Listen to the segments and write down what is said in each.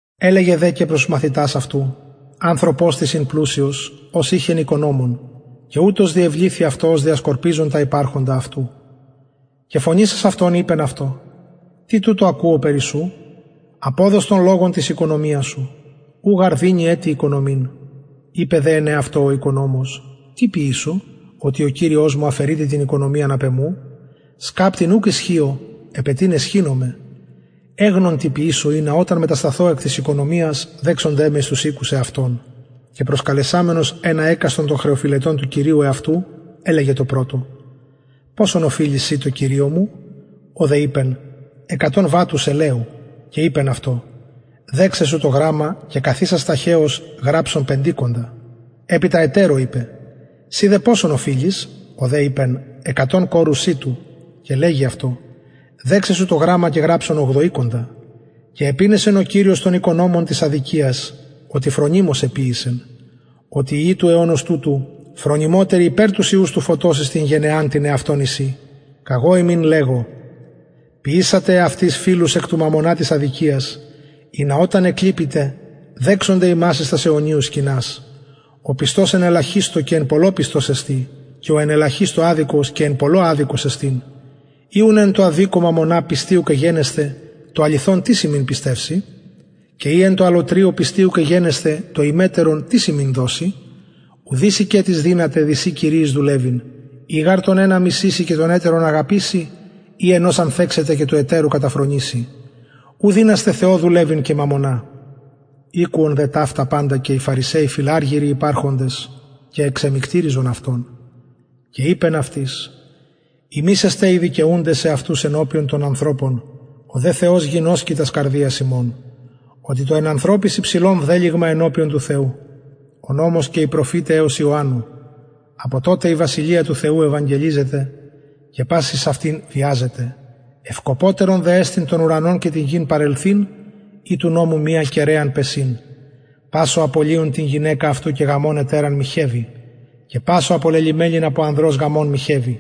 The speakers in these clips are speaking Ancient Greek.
ελεγεν δε και προς τους μαθητας αυτου ανθρωπος τις ην πλουσιος ος ειχεν οικονομον και ουτος διεβληθη αυτω ως διασκορπιζων τα υπαρχοντα αυτου και φωνησας αυτον ειπεν αυτω τι τουτο ακουω περι σου αποδος τον λογον της οικονομιας σου ου γαρ δυνηση ετι οικονομειν ειπεν δε εν εαυτω ο οικονομος τι ποιησω οτι ο κυριος μου αφαιρειται την οικονομιαν απ εμου σκαπτειν ουκ ισχυω επαιτειν αισχυνομαι εγνων τι ποιησω ινα οταν μετασταθω της οικονομιας δεξωνται με εις τους οικους αυτων και προσκαλεσαμενος ενα εκαστον των χρεωφειλετων του κυριου εαυτου ελεγεν τω πρωτω ποσον οφειλεις τω κυριω μου ο δε ειπεν εκατον βατους ελαιου και ειπεν αυτω δεξαι σου το γραμμα και καθισας ταχεως γραψον πεντηκοντα επειτα ετερω ειπεν συ δε ποσον οφειλεις ο δε ειπεν εκατον κορους σιτου και λεγει αυτω δεξαι σου το γραμμα και γραψον ογδοηκοντα και επηνεσεν ο κυριος τον οικονομον της αδικιας οτι φρονιμως εποιησεν οτι οι υιοι του αιωνος τουτου φρονιμωτεροι υπερ τους υιους του φωτος εις την γενεαν την εαυτων εισιν καγω υμιν λεγω ποιησατε εαυτοις φιλους εκ του μαμωνα της αδικιας ινα οταν εκλιπητε δεξωνται υμας εις τας αιωνιους σκηνας ο πιστος εν ελαχιστω και εν πολλω πιστος εστιν και ο εν ελαχιστω αδικος και εν πολλω αδικος εστιν ει ουν εν τω αδικω μαμωνα πιστοι ουκ εγενεσθε το αληθινον τις υμιν πιστευσει και ει εν τω αλλοτριω πιστοι ουκ εγενεσθε το υμετερον τις υμιν δωσει ουδεις οικετης δυναται δυσιν κυριοις δουλευειν η γαρ τον ενα μισησει και τον ετερον αγαπησει η ενος ανθεξεται και του ετερου καταφρονησει ου δυνασθε θεω δουλευειν και μαμωνα ηκουον δε ταυτα παντα και οι φαρισαιοι φιλαργυροι υπαρχοντες και εξεμυκτηριζον αυτον και ειπεν αυτοις υμεις εστε οι δικαιουντες εαυτους ενωπιον των ανθρωπων ο δε θεος γινωσκει τας καρδιας υμων οτι το εν ανθρωποις υψηλον βδελυγμα ενωπιον του θεου ο νομος και οι προφηται εως ιωαννου απο τοτε η βασιλεια του θεου ευαγγελιζεται και πας εις αυτην βιαζεται ευκοπωτερον δε εστιν τον ουρανον και την γην παρελθειν η του νομου μιαν κεραιαν πεσειν πας ο απολυων την γυναικα αυτου και γαμων ετεραν μοιχευει και πας ο απολελυμενην απο ανδρος γαμων μοιχευει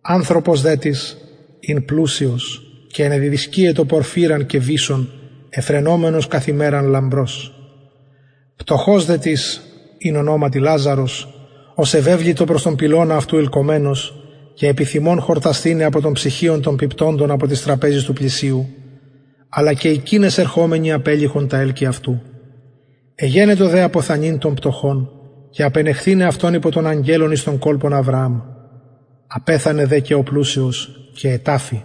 ανθρωπος δε τις ην πλουσιος και ενεδιδυσκετο πορφυραν και βυσσον ευφραινομενος καθ ημεραν λαμπρως πτωχος δε τις ην ονοματι λαζαρος ος εβεβλητο προς τον πυλωνα αυτου ηλκωμενος και επιθυμων χορτασθηναι απο των ψιχιων των πιπτοντων απο της τραπεζης του πλουσιου αλλα και οι κυνες ερχομενοι απελειχον τα ελκη αυτου εγενετο δε αποθανειν τον πτωχον και απενεχθηναι αυτον υπο των αγγελων εις τον κολπον αβρααμ απεθανεν δε και ο πλουσιος και εταφη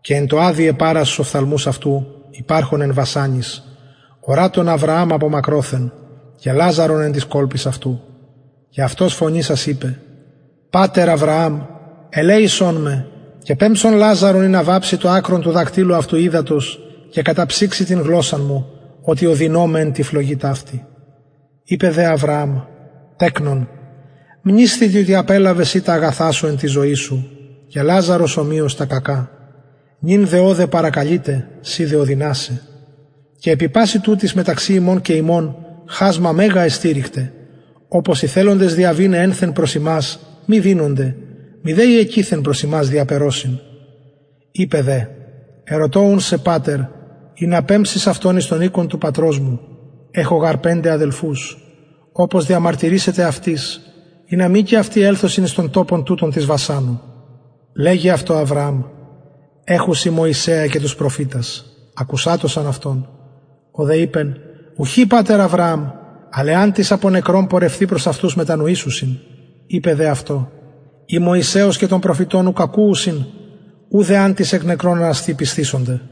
και εν τω αδη επαρας τους οφθαλμους αυτου υπαρχων εν βασανοις ορα τον αβρααμ απο μακροθεν και λαζαρον εν τοις κολποις αυτου και αυτος φωνησας ειπεν πατερ αβρααμ ελεησον με και πεμψον λαζαρον ινα βαψη το ακρον του δακτυλου αυτου υδατος και καταψυξη την γλωσσαν μου οτι οδυνωμαι εν τη φλογι ταυτη ειπεν δε αβρααμ τεκνον μνησθητι οτι απελαβες συ τα αγαθα σου εν τη ζωη σου και λαζαρος ομοιως τα κακα νυν δε ωδε παρακαλειται συ δε οδυνασαι και επι πασιν τουτοις μεταξυ ημων και υμων χασμα μεγα εστηρικται οπως οι θελοντες διαβηναι ενθεν προς υμας μη δυνωνται μηδε οι εκειθεν προς ημας διαπερωσιν ειπεν δε ερωτω ουν σε πατερ ινα πεμψης αυτον εις τον οικον του πατρος μου εχω γαρ πεντε αδελφους οπως διαμαρτυρηται αυτοις ινα μη και αυτοι ελθωσιν εις τον τοπον τουτον της βασανου λεγει αυτω αβρααμ εχουσιν μωσεα και τους προφητας ακουσατωσαν αυτων ο δε ειπεν ουχι πατερ αβρααμ αλλ εαν τις απο νεκρων πορευθη προς αυτους μετανοησουσιν ειπεν δε αυτω ει μωσεως και των προφητων ουκ ακουουσιν ουδε εαν τις εκ νεκρων αναστη πεισθησονται